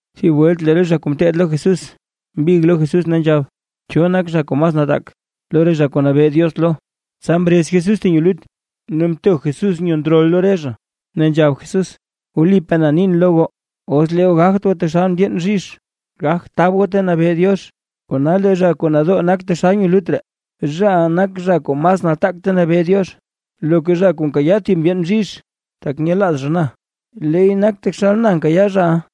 Thib welt lee re zha kuu ngeteed lo Jesús, mbig lo Jesús ne nzhab: ―¿Cho nak zha kuu mas nataak lo re zha kuu nabee Diox lo? Tsa mrez Jesús thib nyo lut, ne mto Jesús nyo ndrol lo re zha. Ne nzhab Jesús: ―Wlipaa na nin lo goo, os lee goo gagt goo taxal ndyeen bzhizh, gagt tab goo ta nabee Diox. Kona lee zha kuu nadoo nak taxal nyo lut ree, zhaʼa nak zha kuu mas nataak ta nabee Diox. Loka zha kuu nkayaa thib re ndyeen bzhizh, tak nyelaaz zha na, leey nak taxal na nkayaa zhaʼa.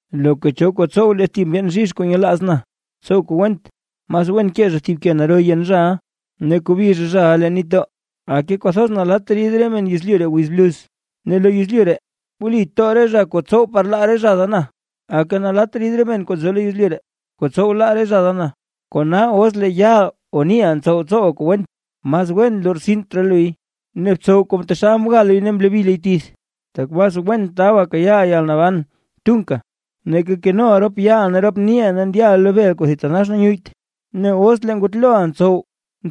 ’Loka cho kuu tsow lee thib re ndyeen bzhizh kuu nyelaaz na, tsow kuu went; mas wen kee zha thib ke naro yen zhaʼa, ne kobi zha zhaʼa leen nitdoo. ¡Aka! Kwathoz nalatt rid re men yezlyu ree wiz bluz, ne lo yezlyu ree wli too re zha kuu ntsow par laa zha da na. Aka nalat rid re men kuu nzo lo yezlyu ree, kuu tsow laa re zha da na. ’Kona os lee yaaʼa o niiʼa ntsow ntsowa kuu went, mas wen lortsint raa luy, ne btsow taxal mga luy ne mlobi luy tith, tak mas wen taba kayaaʼa yalnaban kuu thitanax tunka, nake nkenoʼa rop yaaʼa ne rop niiʼa ne ndyaʼa lo bel kuu thitanax nyuyyt. Ne os lee ngutloʼa ntsow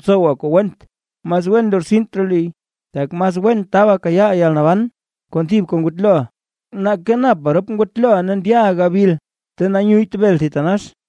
tsowa kuu went, mas wen lortsint raa luy, tak mas wen taba kayaaʼa yalnaban kon thibka ngutloʼa, nake napa rop ngutloʼa ne ndyaʼa gabil ta nyuyyt bel thitanax.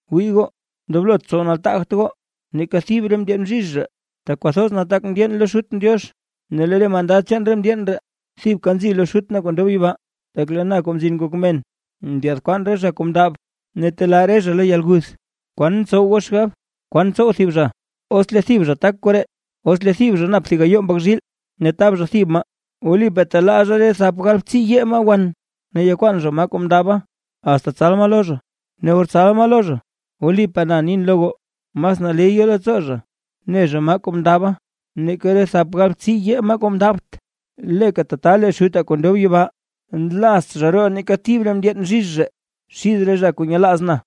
’Wii goo ndoblot tsow nataagt goo, neeka thib re ndyeen bzhizh ree, tak kwathoz nataak ndyeen lo Xutʼn Diox, ne lee re mandad chaan re ndyeen ree thibka nzi lo Xutʼn kuu ndob yibaa. Tak lee na Kuu Mzin Ngok Men, ndyaad kwaan re zha kuu mndab ne telaa re zha lo yalguth. ’¿Kwan ntsow goo xgab, kwan tsow thib zha, os lee thib zha tak koree? Os lee thib zha nap thib gayoo mbak zhiil ne tab zha thib maa, wlipaa telaa zha tedib re thap galbtsiiyee maa wan, ne yakwaan zha maa kuu mndaba, asta tsal maa lo zha. Ne or tsal maa lo zha, wlipaa na nin lo goo, mas naley yo leettsoo zha ne zha maa kuu mndaba, nake re thap galbtsiiyee maa kuu mndabt. Leeka tata lee Xutaa kuu ndob yibaa, nlaazt zha roo neeka thib re ndyeen bzhizh ree xid re zha kuu nyelaaz na.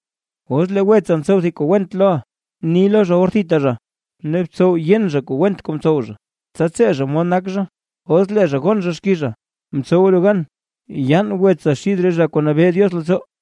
’Os lee wetsa ntsow thib kuu went loʼa, bni lo zha or thita zha, ne btsow yen zha went kuu mtsow zha, tsa tsee zha mod nak zha. Os lee zha gon zha xkiiza, mtsowa lu gan yaan wetsa xith re zha kuu nabee Diox leettsoo.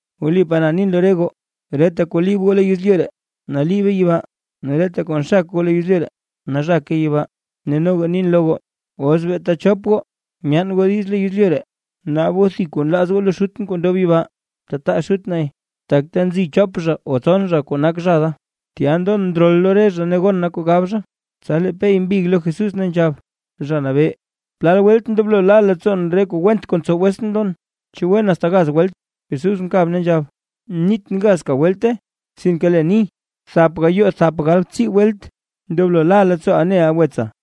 ’Wlipaa na nin lo re goo, reta kuu liib goo lo yezlyu ree, naliibe yibaa; ne reta kuu nxak goo lo yezlyu ree, nazhake yibaa. ’Ne noga nin lo goo: Os beeta chop goo myaan goo diiz lo yezlyu ree, naab goo thib kuu nlaaz goo lo Xutʼn kuu ndob yibaa, tataa Xut nay. Tak ta nzi chop zha o tson zha kuu nak zha da, tya ndon ndrol lo re zha ne gon na kuu gab zha. Tsa lee Pey mbig lo Jesús ne nzhab: ―Zha Nabee, ¿plal welt ndoblo la leettsoon lo re kuu went kuu ntsow wetsʼn lon? ¿Chu wen asta gaz welt? Jesús mkab ne nzhab: ―Nitʼn gazka welte, sinke leen ni: Thap gayoo thap galbtsii welt, ndoblo la leettsooʼa neʼa wetsa.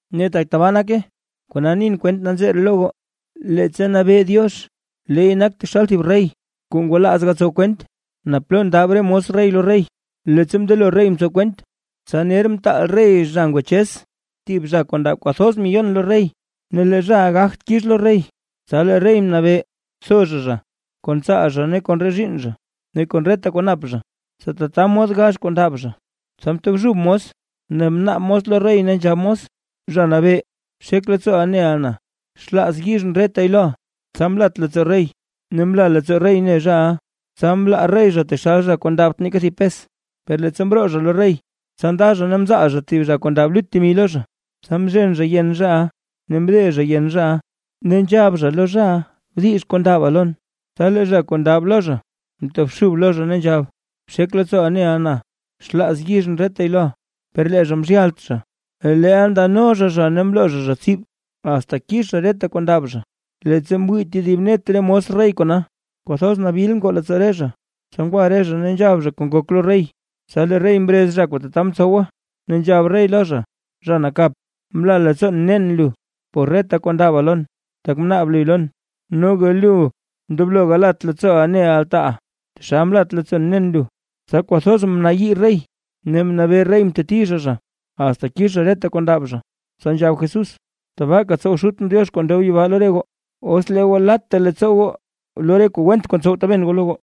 ’Ne tak tabaa nake, kona nin kwent nanzee ree lo goo. Leettsa nabee Diox, leey nak taxal thib rey, kuu ngwalaaz gatsow kwent naa plo ndab re mos rey lo rey. Leettsa mndelo rey mtsow kwent, tsa ner mtaal rey zha ngwachez thib zha kuu ndab kwathoz miyon temi lo rey. Ne lee zhaʼa gagt kix lo rey, tsa lee rey mnabee: “Tho zha zha, kon tsaal zha ne kon re zhiinn zha ne kon reta kuu nap zha, tsa tata mod gax kuu ndab zha”. Tsa mtobxub mos ne mnaab mos lo rey ne nzhab mos: “Zha nabee bxek leettsooʼa neʼa na; xlaaz yizhʼn retay loʼa”. Tsa mlat leettsoo rey ne mla leettsoo rey mne zhaʼa, tsa mlaa rey zha taxal thib zha kuu ndabt neeka thib pes. ’Per leettsa mroo zha lo rey, tsa nda zha ne mzaal zha thib zha kuu ndab lut temi lo zha. Tsa mzhen zha yen zhaʼa ne mde zha yen zhaʼa, ne nzhab zha lo zhaʼa: “¡Bdix kuu ndaba lon!” Tsa lee zha kuu ndab lo zha, mtobxub lo zha ne nzhab: “Bxek leettsooʼa neʼa na; xlaaz yizhʼn retay loʼa”. Per lee zha mzhyalt zha, leel ndano zha zha ne mloo zha zha tsib, asta kix zha reta kuu ndab zha. Leettsa mwii tedib net re mos rey kona, kwathoz nabil ngoo leettsoo re zha, tsa ngwa re zha ne nzhab zha kuu ngok lo rey. Tsa lee rey mrez zha kuu tata mtsowa, ne nzhab rey lo zha: “¡Zha nakap! Mla leettsoon mnen lu por reta kuu ndaba lon, tak mnaab luy lon. Noga lu ndoblo galat leettsooʼa ganeʼa altaaʼa, taxal mlat leettsoon mnen lu.” Tsa kwathoz mnayii rey, ne mnabee rey mteti zha zha, asta kix zha reta kuu ndab zha. Tsa nzhab Jesús: ―Tabaaka tsow Xutʼn Diox kuu ndob yibaa lo re goo, os lee goo latta leettsoo goo lo re kuu went kuu ntsow taben goo lo goo.